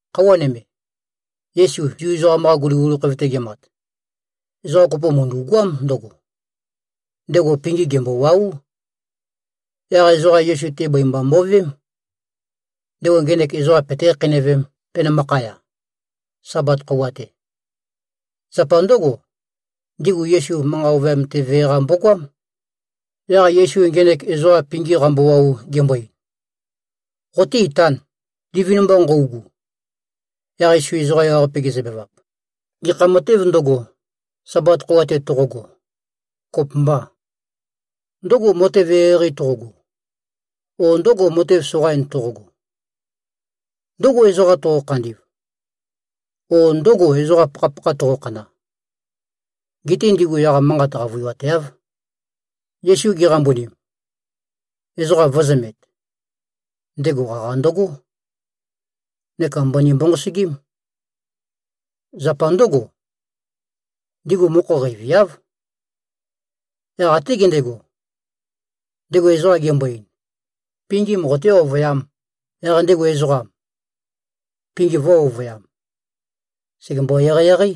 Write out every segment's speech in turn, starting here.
Khøuwa nøme, Yesu Zu ezoqam-qa guliguli khoev-te gemat, ezoqa kopo mø̀ndu꞉goám ndøgo. Ndego pingim gèmbowáu. Yaq ezoqa Yesu-te bøi mba mo꞉veém, ndego ngenek ezoqam peté-khakheinøvēm, penømakhaya, Sabat khøuwa-te. Zapa ndǿgo, ndigu Yesu manqa ovøyam-te vee-qa mbogoám. Yaq Yesu ngenek ezoqam pingim qambowau gembo-ein, “Qoté-itān, livin-mba nqøugu.” Yaq Yesu ezoqa ewaqape gezøbevap, “Gekha matêv ndøgo, Sabat khøuwa-te toqogo, kopømba? Ndǿgò, matev eqeieqei toqogo, o ndǿgò, matev soqain toqogo? Ndǿgò, ezoqa toqo-khandi꞉v, o ndǿgò, ezoqa pakhapakha toqokhana?” Geté ndigu yaq manqat qavøiwateáv. Yesu geqambunim, ezoqa vø̄zømet, ndego qaqa ndøgó, neka mbøni mbonqosøgím. Zapa ndǿgo, ndigu mokho qeiviáv. Yaq até gendego, ndego ezoqam gembo-ein, “Pingim qoté-ovøyām.” Yaq ndego ezoqam, pingim vø̄-ovøyam. Sègembo-eqeieqeí.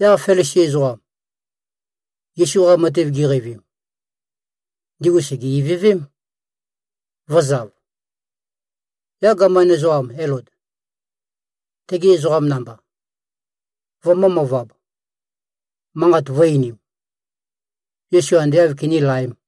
Yaq Felisi ezoqam, Yesu-qa matev giqeivim, ndigu sège-ivøvém, vø̄zav, yaq gaman ezoqam Elod, tegi ezoqam namba, vømø̄-møvab, manqat vø̄-einim, Yesu ande āv kinílaēm.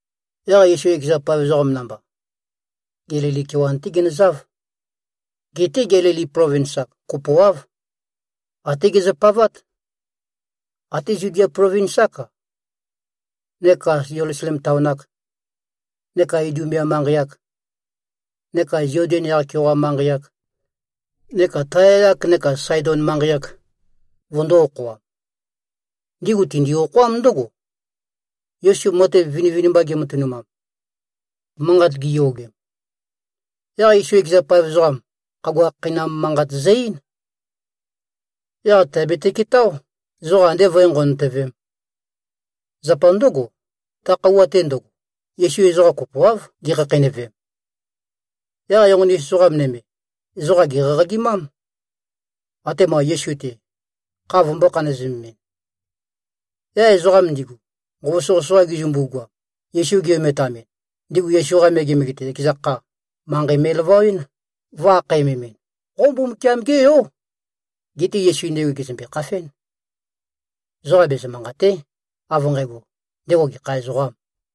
Yaq Yesu ekeza paev ezoqam namba, Gelili kewan-té ginøzáv. Geté Gelili plovins-ak kopoáv, até gezøpavát. Até Zudia plovins-ák-a, neka Zelusalem taon-ak, neka Idumea manqei-ak, neka Zoden kea yaq-keoqa manqei-ak, neka Taya-yak neka Saedon manqei-ak, vøndō-okhoam. Ndigu tindi-okhoám ndǿgo, Yesu matev vinivinimba ge꞉matønumam, manqat giyogem. Yaq Yesu ekeza paev ezoqam, khagua khakheinam manqat zø-eín. Yaq tèabete-ketáo, ezoqa andé vǿe-nqonøtøvēm. Zapa ndǿgo, ta khøuwa-te ndøgo, Yesu ezoqa kopoáv, gekhakheinøvem. Yaq enqoni-us ezoqa nøme, ezoqam gèqaqagimám, atema Yesu-te, kha vømbō-khanøzemɨn. Yaq ezoqam ndigu, nqova soqøsoqa gizømbu-goam, Yesu gi-ometamɨn, ndigu Yesu-qa megemege-te, ekeza kha, manqei me꞉lavawɨ́n, vø̄-akhæmemɨn, “Qo Mbumbukiam-gé yó.” Geté Yesu ndigu gèzømbe-khafén. Ezoqa bezø-manqàte᷄ av nqægo, ndego gekha ezoqām.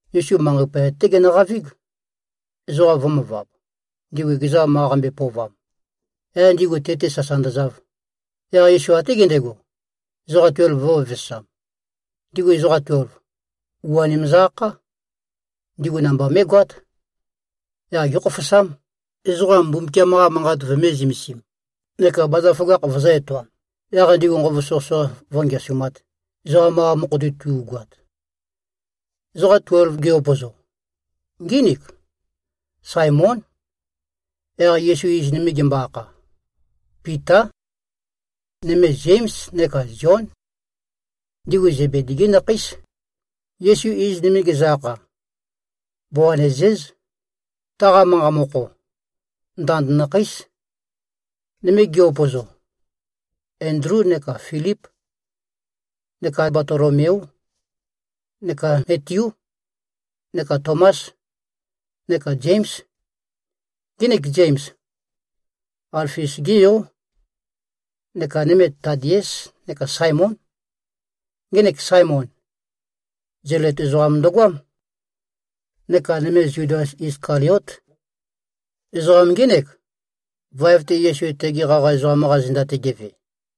Yesu manqei poyat-té genøqavíg, ezoqa vø̄møvab, ndigu ekeza ma qambøe-pøovam. Yaq ndigu te-te sasa ndøzav. Yaq Yesu até gendego, ezoqa tuelv vø̄vevesam. Ndigu ezoqa tuelv, u-anim zø-akhá. Ndigu namba mé꞉goát. Yaq gékhofosám, ezoqam Mbumbukiam-qa Manqat vømé-zømesīm, neka bazaføgakh vøzǿ-etoām, yaq ndigu nqova soqøsoqa vǿngeasumāt, ezoqam-qa mokho-te tu꞉goat. Ezoqa tuelv gi-upøzo, ngínik: Saemón. Yaq Yesu iz nøme gembo-akha, Pitá. Nøme Zéms neka Zión. Ndigu Zebedi-gí nakhéis. Yesu iz nøme gezø-akha, Boanezéz. Taqa manqa mokho, “Ndand nakhéis.” Nøme gi-upøzo, Endlú neka Filíp, neka Batolomeú, neka Metiú, neka Tomás, neka Zéms. Ngenek Zems, Alfius-gé yó. Neka nøme Tadiés neka Saemón. Ngenek Saemon, Zelot ezoqam ndøgoám. Neka nøme Zudas Iskaliót. Ezoqam ngének, vaev-te Yesu tegi qaqa ezoqam-qa zenda-te geve.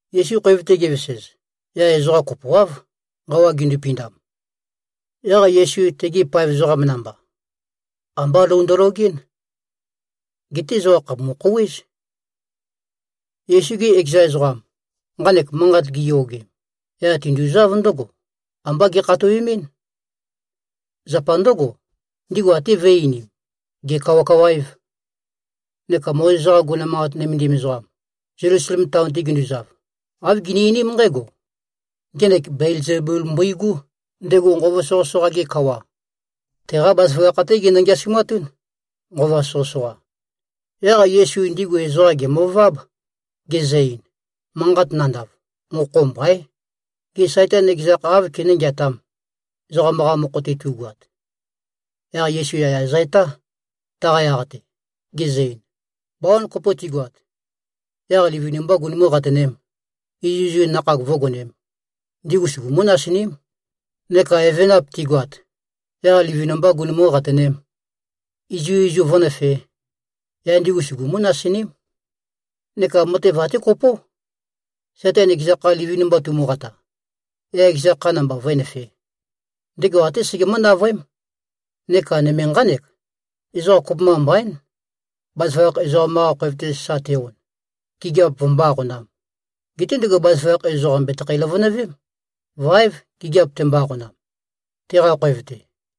Yesu khoev-te gevesez, yaq ezoqa kopoáv, nqawa gindupindam. Yaq Yesu tegi paev ezoqam namba, ambá lou ndølogɨ́n. Geté ezoqam khàpumu-khouwéz. Yesu-gi ekeza ezoqam, nqanek manqat giyogem, yaq tinduzáv ndǿgo. Ambá gekhatowemɨ́n. Zapa ndǿgo, ndigu até vø̄e-einim, gèkawakawaév. Neka Mozes-qa guguna manqat nømendim ezoqam, Zelusalem taon-te ginduzav, āv gini-einím nqǽgo, “Ngenek Belzebul mbøigú, ndego nqova soqøsoqa-ge kawa. Teqá bazaføgakh-té genø-ngeasumatún, nqova soqøsoqa.” Yaq Yesu ndigu ezoqam gèmøváb, gezø-ein, “Manqat nandav, mokho mbaín. Gê, Saitan ekeza kha áv kené-ngeatām, ezoqam-qa mokho-te tu꞉goat?” Yaq Yesu yaya zø-etá, taqa yaq-te, gezø-ein, “Bawan kopo tigoat, yaq livin-mbā gunumú-qatønēm, izuizu nakhag vǿgonēm, ndigu sugumú-nasiním. Neka evenap tigoat, yaq livin-mbā gunumú-qatønēm, izuizu vǿnøfē, yaq ndigu sugumú-nasiním. Neka matev até kopó. Saitan ekeza kha livin-mba tumuqata, yaq ekeza kha namba vǿenøfē, ndego até segemǿ-navøém. Neka nøme nqánek: Ezoqa kopømba mbaín, bazaføgakh ezoqam-qa khoev-te sa te-on, gigiap vømbó-aqonām. Geté ndego bazaføgakh ezoqam bètøkho-løvønøvém. Váev gigiap tembo-aqonam, teqa khoev-te.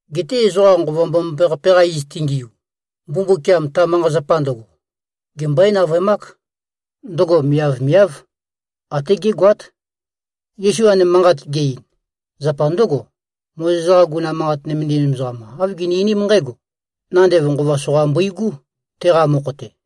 Geté ezoqa Nqova Mbomambaqape-qa iz tengiu, Mbumbukiam ta manqa-zapa ndøgo, gembøé-navøemák. Ndøgo miavmiáv, até gégoát.” Yesu nqanek manqat ge-ein, zapa ndǿgo: Mozes-qa guguna manqat nømendim ezoqam āv gini-einím nqǽgo, “Nandev nqova soqa mbøigú, teqa mokho-te.”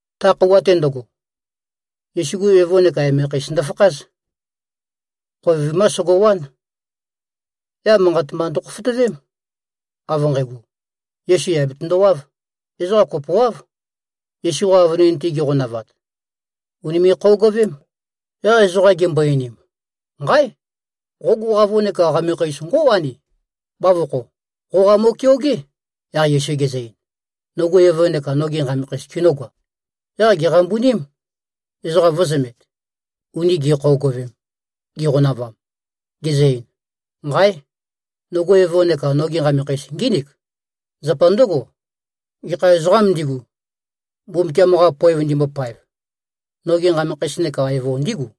Ta khøuwa-te ndøgo, Yesu-gu evo neka emekheis ndøfakház. Khoev vimá sogowán. Yaq manqat mba ndøkhofotøvém, av nqægo, Yesu yà betøndowáv. Ezoqa kopoáv, Yesu-qa avønin-te giqonavat. Ùnime꞉-khøogøvém. Yaq ezoqa gimbo-einim, “Nqáe! Qogu qavo neka qamekheis ngó꞉wani, bavokho. Qoqa mo꞉keogé.” Yaq Yesu gezø-ein, “Nogu evo neka nogi nqamekheis kinǿgoam?” Yaq gèqambuním, ezoqa vø̄zømet, uni gi꞉khøogøvem, giqonavam, gezø-ein, “Nqáe! Nogu evo neka nogi nqamekheis ngínik! Zapa ndǿgo, gekha ezoqām ndigu, Mbumbukiam-qa poev ndimbopaev, nogi nqamekheis neka evo ndígu.”